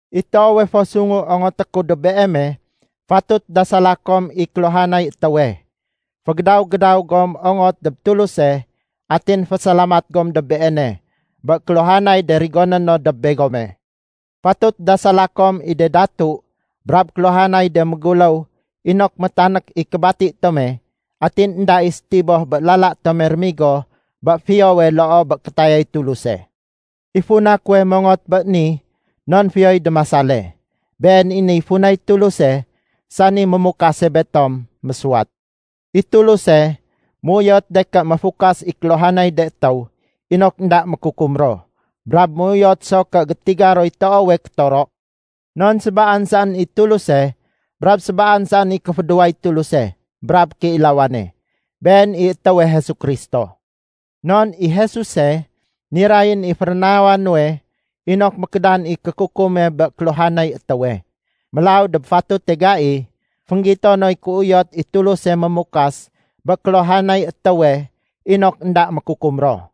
I toowe fo sungu ongoté ku dob beeme, fatut dasala kom i kéluhanay étéwe. Fégédaw-gédaw gom ongot dob Tuluse atin fésalamat gom dob Beene bé kéluhanay de rigoné no dob begome. Fatut dasala kom i de datu brab kéluhanay de méguléw inok métanék i kébati tome atin énda i sétiboh bé lala tome rémigo bé fiyowe loo bé kétayay Tuluse. I funa kuwe mongot bé ni non fiyoy démasale. Been i niy funay Tuluse, sani mémukase betom, mésuwat. I Tuluse méuyot de ké méfukas i kéluhanay de étéw inok énda mékukum ro. Brab méuyot so ké gétiga roy toowe kétoro. Non sébaan saén i Tuluse brab sébaan saén i kéfédéway Tuluse brab kéilawane, Been i étéwe Jesu Kristo. Non i Jesuse, nirayén i férénawa nuwe inok mékédan i kékukume bé kéluhanay étéwe. Mélaw dob fatute gai, fénggito noy kéuyot i Tuluse mémukas bé kéluhanay étéwe inok énda mékukum ro.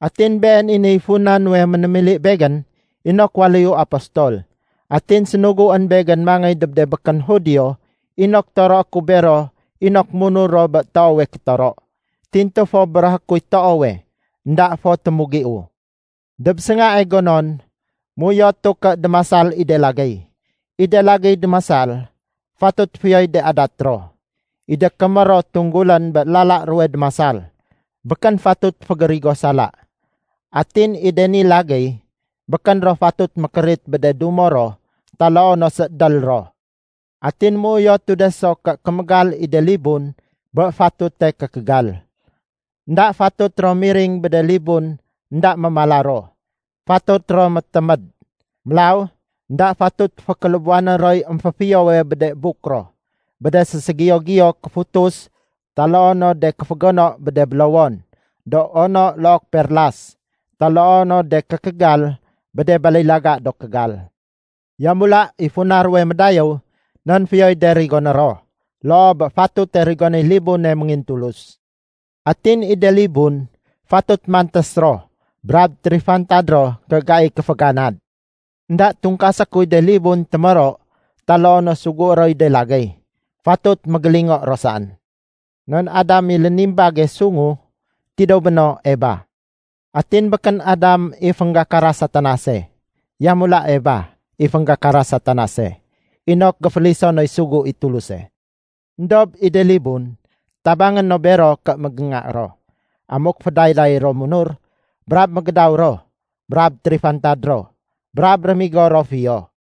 Atin been i niy funa nuwe ménémili begén inok waléyu apostol, atin sénuguén begén mangéy dob de békén Judio inok toroé ku bero inok munur ro bé toowe kétoro. Tintu fo béréhé kuy toowe, énda fo témugiu. Dob séngae gonon, méuyotu ké démasal i de lagéy. I de lagéy démasal, fatut fiyoy de adat ro. I de kémér ro tunggulén bé lala ruwe démasal, békén fatut fégérigo sala. Atin i de ni lagéy, békén ro fatut mékérit bé de dumo ro taloo no séédél ro. Atin méuyotu de so ké kémégal i de libun bé fatute kékégal. Enda fatut ro miring bé de libun énda mémala ro. Fatut ro météméd. Mélaw énda fatut fékélébuwané roy émféfiyowe bé de buk ro bé de séségiyo-giyo kéfutus taloo no de kéfégono bé de bélowon do ono look perlas, taloo no de kékégal bé de balilaga do kégal. Yamula i funa ruwe médayéw non fiyoy de rigoné ro loo bé fatute rigonéy libune méngintulus. Atin i de libun fatut mantés ro brab térifantad ro ké gai kéféganad. Enda tungkasé kuy de libun témoro taloo no sugué roy de lagéy. Fatut mégélingo ro saén. Non Adam i lénimbage sungu, tidéw béno Eba. Atin békén Adam i fénggakara Satanase. Yamula, Eba i fénggakara Satanase inok géféliso noy sugu i Tuluse. Endob i de libun, tabangé no bero ké mégénga ro, amuk fédayday ro munur, brab mégédaw ro, brab térifantad ro, brab rémigo ro fiyo.